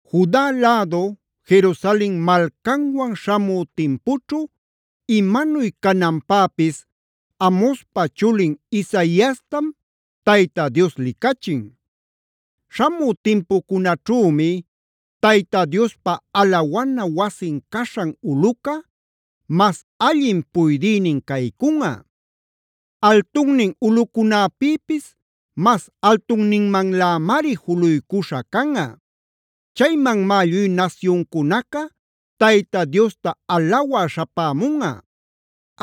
Juda lädu, Jerusalen malcanwan śhamü timpućhu imanuy cananpäpis Amozpa chulin Isaiastam Tayta Dios licachin: Śhamü timpucunäćhümi Tayta Diospa alawana wasin caśhan ulꞌuca, mas allin puydïnin caycunꞌa. Altunnin ulꞌucunäpïpis mas altunninmanlämari juluycuśha canꞌa. Chaymanmá lluy nasyuncunaca Tayta Diosta alawä śhapämunꞌa.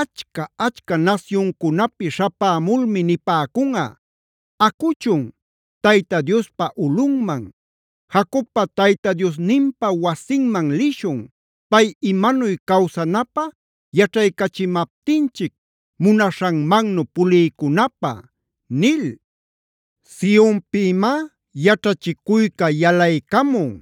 Achca-achca nasyuncunapi śhapämulmi nipäcunꞌa: “Acuchun, Tayta Diospa ulꞌunman, Jacobpa Tayta Diosninpa wasinman lishun, pay imanuy cawsanapä yaćhaycachimaptinchic munaśhanmannu puliycunapä” nil. Sionpïmá yaćhachicuyca yalaycamun;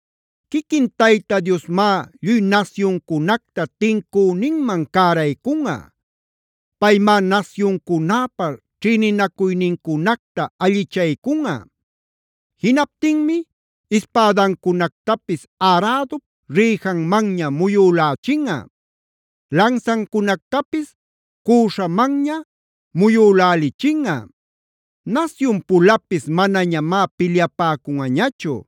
Quiquin Tayta Diosmá lluy nasyuncunacta tincüninman cäraycunꞌa. Paymá nasyuncunäpa ćhïninacuynincunacta allichaycunꞌa. Jinaptinmi ispädancunactapis arädup rïjanmanña muyülächinꞌa; lansancunactapis cüśhamanña muyülälichinꞌa. Nasyun-pulapis manañamá pilyapäcunꞌañachu;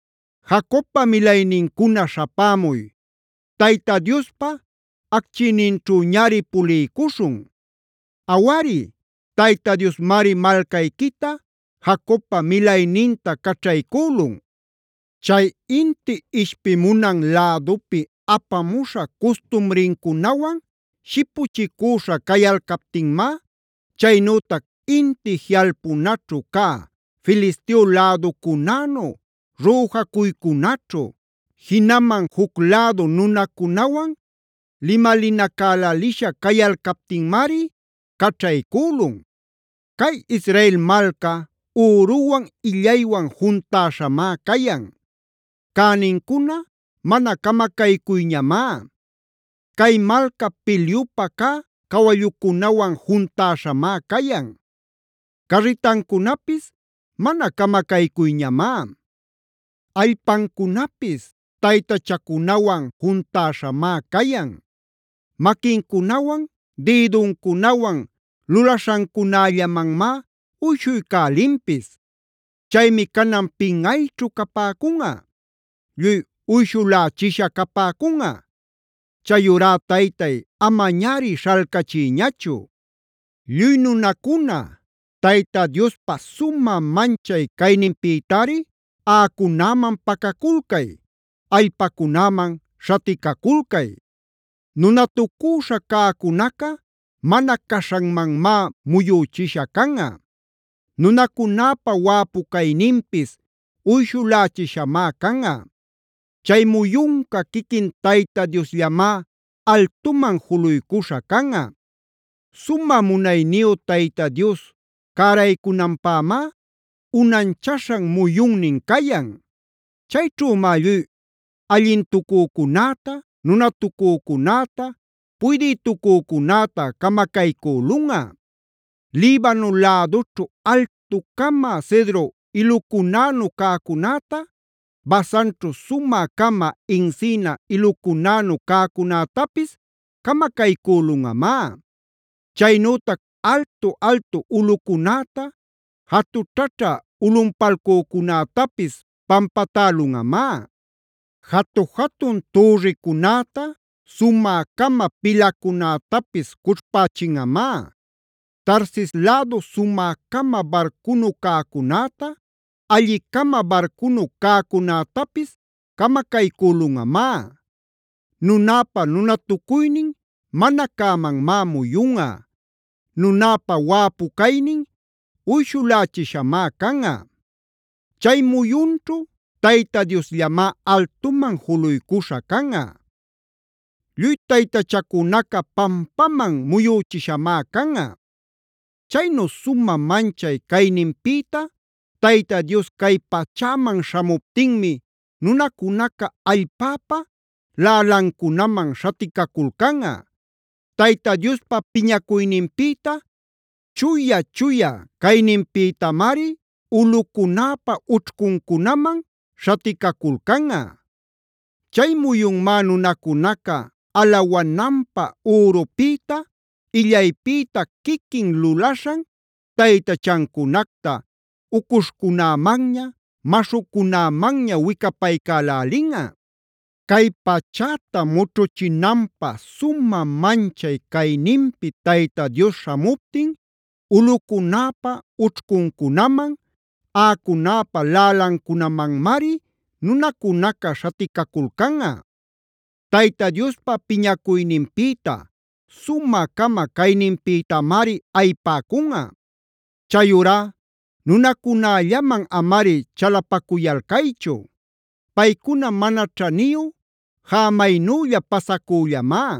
Jacobpa milaynincuna śhapämuy; Tayta Diospa achquiyninćhüñari puliycuśhun. Awari, Tayta Diosmari malcayquita, Jacobpa milayninta caćhaycülun. Chay inti ishpimunan lädupi apamuśha custumricunawan shipuchicüśha cayalcaptinmá, chaynütac inti jiꞌalpunaćhu cä Filisteo läducunänu rüjacuycunaćhu, jinaman juc lädu nunacunawan limalinacälälisha cayalcaptinmari caćhaycülun. Cay Israel malca üruwan illaywan juntäśhamá cayan; cänincuna mana camacaycuyñamá. Cay malca pilyupä cä cawallucunawan juntäśhamá cayan; carritancunapis mana camacaycuyñamá. Allpancunapis taytachacunawan juntäśhamá cayan. Maquincunawan, dïduncunawan lulaśhancunällamanmá uyshuycälinpis. Chaymi canan pinꞌayćhu capäcunꞌa; lluy uyshulächisha capäcunꞌa. Chayurá Taytay, amañari śhalcachiyñachu. Lluy nunacuna, Tayta Diospa sumä manchay cayninpïtari aꞌacunäman pacaculcay;c allpacunäman śhaticaculcay. Nunatucüśha cäcunaca mana caśhanmanmá muyüchisha canꞌa; nunacunäpa wäpu cayninpis uyshulächishamá canꞌa. Chay muyunca quiquin Tayta Diosllamá altuman juluycuśha canꞌa. Sumä munayniyu Tayta Dios cäraycunanpämá, unanchaśhan muyunnin cayan. Chayćhümá lluy allintucücunäta, nunatucücunäta, puydïtucücunäta camacaycülunꞌa. Libano lädućhu altu-cama cedro ilucunänu cäcunäta, Basanćhu sumä-cama encina ilucunänu cäcunätapis camacaycülunꞌamá. Chaynütac altu-altu ulꞌucunäta, jatućhaćhä ulꞌunpalcücunätapis pampatälunꞌamá. Jatu-jatun türricunäta, sumä-cama pilacunätapis cućhpächinꞌamá. Tarsis lädu sumä-cama barcunu cäcunäta, allin-cama barcunu cäcunätapis camacaycülunꞌamá. Nunäpa nunatucuynin mana cämanmá muyunꞌa; nunäpa wäpucaynin uyshulächishamá canꞌa. Chay muyunćhu Tayta Diosllamá altuman juluycuśha canꞌa. Lluy taytachacunaca pampaman muyüchishamá canꞌa. Chaynu sumä manchay cayninpïta Tayta Dios cay pachäman śhamuptinmi nunacunaca allpäpa lälancunamand śhaticaculcanꞌa; Tayta Diospa piñacuyninpïta, chuya-chuya cayninpïtamari ulꞌucunäpa ućhcuncunaman śhaticaculcanꞌa. Chay muyunmá nunacunaca alawananpä ürupïta, illaypïta quiquin lulaśhan taytachancunacta ucuśhcunämanña, maśhucunämanña wicapaycälälinꞌa. Cay pachäta mućhuchinanpä sumä manchay cayninpi Tayta Dios śhamuptin, ulꞌucunäpa ućhcuncunaman, aꞌacunäpa lälancunamanmari nunacunaca śhaticaculcanꞌa; Tayta Diospa piñacuyninpïta, sumä-cama cayninpïtamari ayipäcunꞌa. Chayurá nunacunällaman amari chalapacuyalcaychu. Paycuna mana ćhaniyu, jämaynülla pasacüllamá.